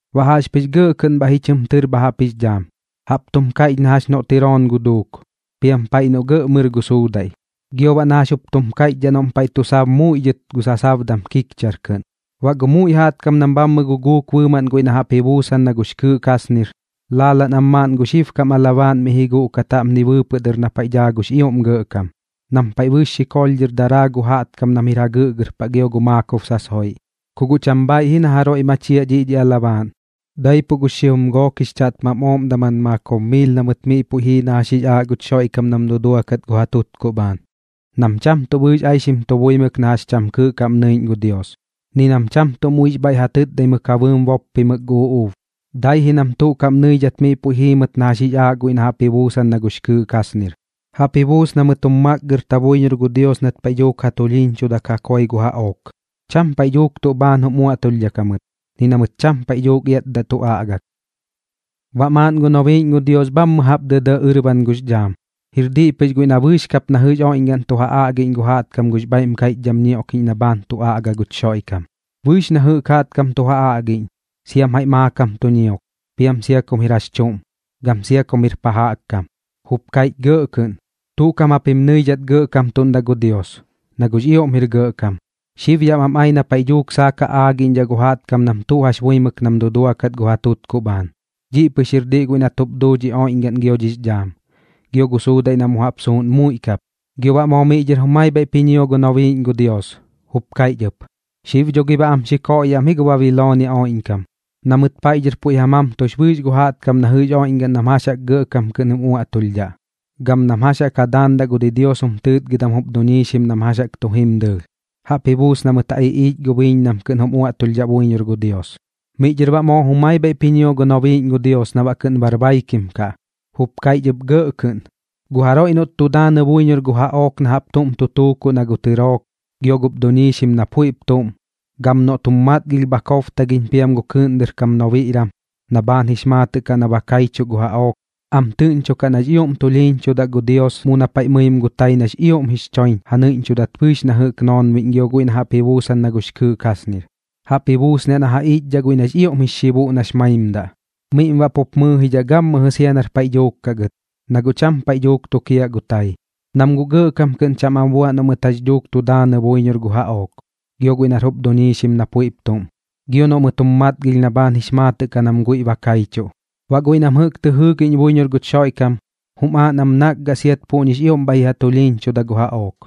Baꞌ jaꞌxpɨx gɇꞌ kɨꞌn bhaiꞌ ji chɨm tɨr bha jaꞌp jix dhaam, jaꞌp tum kaiꞌch na jax noꞌ tɨroon gu duuk, piam paiꞌ noꞌ gɇꞌ mɨr gu suudaiꞌ, gio baꞌ na jax jup tum kaiꞌchdhaꞌ noꞌm paiꞌ tu sab muiꞌ dhɨt gu sasabdam kikchar kɨꞌn. Baꞌ gu muiꞌ jaꞌtkam nam bhaiꞌ guguuk bɨɨmaꞌn guiꞌ na jaꞌp ji buusan na gux kɨɨꞌ kasnir, laalaꞌn am maaꞌn gu xibkam alabaaꞌn miꞌ ji guꞌkat jaꞌpni bɨɨpɨꞌ dɨr na paiꞌ daa gux ioꞌm Gɇꞌkam, nam paiꞌ bɨɨx xikoolh dhɨr daraa gu jaꞌtkam nam jir jagɨꞌgɨr paꞌ gio gu maakob sasoiꞌ. Ku guꞌ cham bhaiꞌ ji na jaroiꞌ machiaꞌ dhiꞌ dhi alabaaꞌn, daipuꞌ gux xijum gook jix chaꞌtmam ooꞌm daman maakob miil na mɨt miꞌ puiꞌ jii na jax jix aaꞌ guch Xoiꞌkam nam duduakat gu ja tutkuꞌ bhaan, nam cham tuꞌ bɨɨx aixim tu buimɨk na jax cham kɨɨꞌ kaꞌm nɨiꞌñ gu Dios, ni nam cham tuꞌ muiꞌx bhaiꞌ ja tɨtdaimɨk ja bɨɨm boppimɨk gu uꞌuub, dai ji nam tuꞌ kaꞌm nɨidhat miꞌ puiꞌ jiimɨt na jax jix aaꞌ guiꞌ na jaꞌp ji buusan na gux kɨɨꞌ kasnir. Jaꞌp ji buus na mɨt jum makgɨrta buiñor gu Dios nat paiꞌ dhuuk ja tulhiiñchudak ja koi gu jaꞌook. Cham paiꞌ dhuuk tuꞌ bhaan jum uaꞌtulhdhak jamɨt, ni na mɨt cham paiꞌ dhuuk iatdaꞌ tu aꞌgak. Baꞌ maaꞌn gu nobiiꞌñ gu Dios bhammɨ jaꞌp dɇdɇꞌ ɨrban gux dhaam, jir diꞌ pɨx guiꞌ na bɨɨx kap na jɨꞌx oiꞌñgaꞌn tu ja aꞌgiꞌñ gu jaꞌtkam gux bhaiꞌm kaiꞌchdham ñioꞌkiꞌñ na bhaan tu aꞌga guch Xoiꞌkam. Bɨɨx na jɨꞌk jaꞌtkam tu ja aꞌgiꞌñ, siam jaiꞌ maakam tu ñiok, piam sia kum jir jax chuꞌm, gam sia kum jir pa jaꞌk kam. Jup kaiꞌch gɇꞌ kɨꞌn: ―Tuꞌ kaꞌm japim nɨidhat gɇꞌkamtuꞌndaꞌ gu Dios, na guꞌx ioꞌm jir gɇꞌkam. Xib yaꞌ bam ai na paiꞌ dhuuk saak ja aagiꞌñdhaꞌ gu jaꞌtkam nam tuꞌ jax buimɨk nam duduakat gu ja tutkuꞌ bhaan. Dhiꞌ pɨx jir diꞌ guiꞌ nat jup duu dhi oiꞌñgaꞌn gio dhix dhaam, gio gu suudaiꞌ na mu jaꞌp suusuꞌn muiꞌ kap. Gio baꞌ moo miꞌ dhɨr jumai bhaiꞌp ji ñio gu nobiiꞌñ gu Dios, jup kaiꞌch ɨp: ―Xib dho gi baꞌ am xi koꞌyaꞌ am ji gu Babiloonia oiꞌñkam, na mɨt paiꞌ dhɨr puiꞌ ja mamtux bɨɨx gu jaꞌtkam na jɨꞌx oiꞌñgaꞌn nam jax jaꞌk gɇꞌkam kɨꞌn jum uaꞌtulhdhaꞌ, gam nam jax jaꞌk ja daandaꞌ gu didios jum tɨɨtgɨdam jup duñiixim nam jax jaꞌk tu jim dɨɨlh. Jaꞌp ji buus na mɨt ja iꞌiich gu biiñ nam kɨꞌn jum uaꞌtulhdhaꞌ buiñor gu Dios. Miꞌ dhɨr baꞌ moo jumai bhaiꞌp ji ñio gu nobiiꞌñ gu Dios na baꞌ kɨꞌn bar baikim kaꞌ, jup kaiꞌch ɨp gɇꞌ kɨꞌn: ―Gu jaroiꞌ noꞌt tu daanɨ buiñor gu jaꞌook na jaꞌp tuꞌm tu tuukuꞌ na gu tɨrook, gio gup duñiixim na puiꞌp tuꞌm, gam noꞌt jum matgilh bha kobtagiꞌñ piam gu kɨɨꞌn dɨr kam nobiꞌram na bhaan jix maatɨꞌ na ba kaichuꞌ gu jaꞌook, am tɨꞌñchokaꞌ nax ioꞌm tulhiiñchudaꞌ gu Dios mu na paiꞌ mɨim gu tai nax ioꞌm jix choiñ ja nɨiꞌñchudat bɨɨx na jɨꞌk noonbiꞌñ gio guiꞌ na jaꞌp ji buusan na gux kɨɨꞌ kasnir, jaꞌp ji buusniaꞌ na ja iꞌchdhaꞌ guiꞌ nax ioꞌm jix xibuꞌ nax maimdaꞌ. Miꞌm baꞌ pu mɨɨjidhaꞌ gammɨjɨ sia nar paiꞌ dhuuk kaꞌ gɨt, na guꞌ cham paiꞌ dhuuk tukiaꞌ gu tai, nam guꞌ gɇꞌkam kɨꞌn cham am bua noꞌ mɨt jax dhuuk tu daanɨ buiñor gu jaꞌook, gio guiꞌ nar jup duñiixim na puiꞌp tuꞌm, gio noꞌ mɨt jum matgilh na bhaan jix maatɨꞌ kaꞌ nam guiꞌ ba kaichuꞌ. Baꞌ guiꞌ nam jɨꞌk tɨ jɨɨgiꞌñ buiñor guch Xoiꞌkam, jum aaꞌ nam nakgaꞌ siat puꞌñix ioꞌm bhaiꞌ ji ja tulhiiñchuda gu jaꞌook,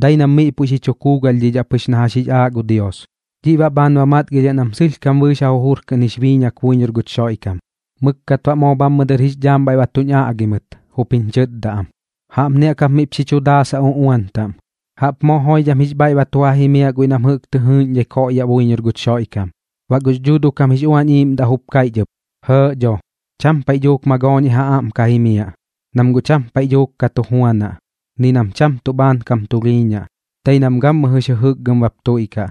dai nam miꞌ puiꞌ xi chu kuugalhdhidhaꞌ pɨx na jax jix aaꞌ gu Dios. Dhiꞌ baꞌ bhaan ba matgilhiaꞌ nam sɨlhkam bɨɨx ja jujur kɨꞌn jix biiñak buiñor guch Xoiꞌkam. Mɨkkat baꞌ moo bhammɨx dhaam dɨr bhaiꞌ ba tuñ aꞌgi mɨt, jup jiñ chɨtda am: ―Jaꞌpni jaꞌk jap miꞌp xi chu daasaꞌ uꞌuan taꞌm: “¡Jaꞌp moo joidham jix bhaiꞌ ba tu ja jimiaꞌ guiꞌ nam jɨꞌk tɨ jɨɨꞌñdhai koꞌyaꞌ buiñor guch Xoiꞌkam!” Baꞌ gux Dhuuduꞌ kam jix Uañ Iiꞌmdaꞌ jup kaiꞌch ɨp: “Jɇɇꞌ dho. Cham paiꞌ dhuuk magooñiꞌ ja aꞌm ka jimiaꞌ, nam guꞌ cham paiꞌ dhuuk ka tu juanaꞌ, ni nam tuꞌ bhaan kam tulhiiñaꞌ, dai nam gammɨjɨx jɨjɨkgɨm bap tuiꞌkaꞌ.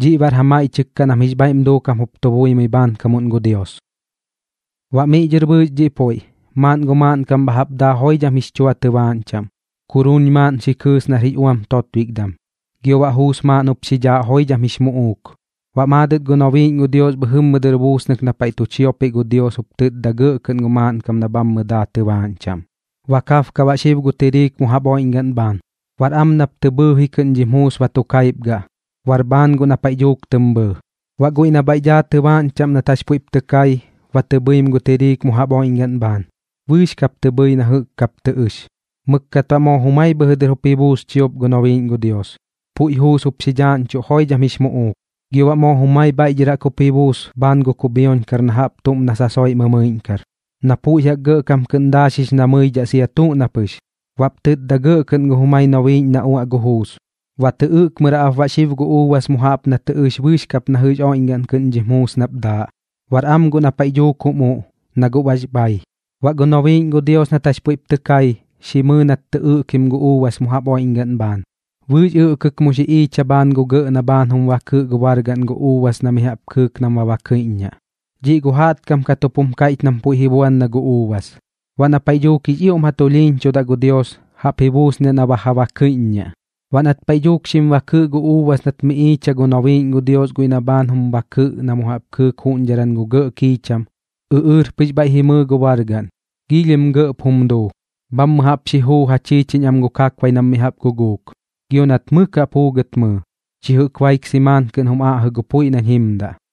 Dhiꞌ baꞌr ja maiꞌchɨk kaꞌ nam jix bhaiꞌm duukam jup tu buimɨi bhaankamuꞌn gu Dios.” Baꞌ miꞌ dhɨr bɨɨx dhiꞌ puiꞌ, maaꞌn gu maaꞌnkam bha jaꞌp daa joidham jix chua tɨbaaꞌñ chaꞌm, kuruun maaꞌn xi kɨɨs nar jix uam totbikdam, gio baꞌ juus maaꞌn jup xi dhaaꞌ joidham jix muꞌuuk. Baꞌ maadɨt gu nobiiꞌñ gu Dios bhɨjɨ dɨr buusnɨk na paiꞌ tu chiopiꞌ gu Dios jup tɨtda gɇꞌ kɨꞌn gu maaꞌnkam na bhammɨ daa tɨbaaꞌñ chaꞌm: ―Ba kabka baꞌ xib gu tiriik mu jaꞌp oiꞌñgaꞌn bhaan. Bar am nap tɨ bhɨɨji kɨꞌn dhim juus ba tu kaipgaꞌ. Bar bhaan guꞌ na paiꞌ dhuuk tɨm bhɨɨ. Baꞌ guiꞌ na bhaiꞌ daa tɨbaaꞌñ chaꞌm nat jax puiꞌp tɨ kai, ba tɨ bhɨim gu tiriik mu jaꞌp oiꞌñgaꞌn bhaan. Bɨɨx kap tɨ bhɨɨ na jɨꞌk kap tɨ ɨx. Mɨkkat baꞌ moo jumai bhɨjɨ dɨr jup ji buus chiop gu nobiiꞌñ gu Dios, puiꞌ juus jup xi dhaaꞌñchuꞌ joidham jix muꞌuuk. Gio baꞌ moo jumai bhaiꞌ dhɨr jup ji buus bhaan gu kubhioñkar na jaꞌp tuꞌm na sasoiꞌ mɨmɨiꞌñkar, na puiꞌ jaꞌk gɇꞌkam kɨꞌn daaxix na mɨidhaꞌ sia tuꞌ na pɨx. Baꞌp tɨtda gɇꞌ kɨꞌn gu jumai nobiiꞌñ gu Dios na uaꞌ gu juus: ―Ba tɨ ɨꞌkmɨraꞌp baꞌ xib gu uubas mu jaꞌp na tɨ ɨx bɨɨx kap na jɨꞌx oiꞌñgaꞌn kɨꞌn dhim juus nap daaꞌ. Bar am guꞌ na paiꞌ dhuuk jum uꞌ, na guꞌ bax bhai. Baꞌ gu nobiiꞌñ gu Dios nat jax puiꞌp tɨ kai, xi mɨɨ nat tɨ ɨꞌkim gu uubas mu jaꞌp oiꞌñgaꞌn bhaan, bɨɨx ɨꞌkɨk mu xi iicha bhaan gu gɇꞌ na bhaan jum bakɨꞌ gu bargaꞌn gu uubas na mi jaꞌp kɨɨk nam baꞌ bakɨiꞌññaꞌ. Dhiꞌ gu jaꞌtkam kat jup jum kaiꞌch nam puiꞌ ji buan na gu uubas, baꞌ na paiꞌ dhuuk jix ioꞌm ja tulhiiñchudaꞌ gu Dios, jaꞌp ji buusniaꞌ na ba ja bakɨiꞌññaꞌ. Baꞌ nat paiꞌ dhuuk xim bakɨꞌ gu uubas nat miꞌ iicha gu nobiiꞌñ gu Dios guiꞌ na bhaan jum bakɨꞌ na mu jaꞌp kɨɨk juꞌñdharan gu gɇꞌ kiicham, ɨꞌɨɨr pɨx bhaiꞌ ji mɨɨ gu bargaꞌn, giilhim gɇꞌp jum duu, bhammɨ jaꞌp xi juu ja chiichiñ am gu kakbai nam mi jaꞌp guguuk, gio nat mɨk jaꞌp juugɨt mɨɨ, chi jɨꞌk baik simaan kɨꞌn jum aꞌjɨ gu puiꞌ nañ jimdaꞌ.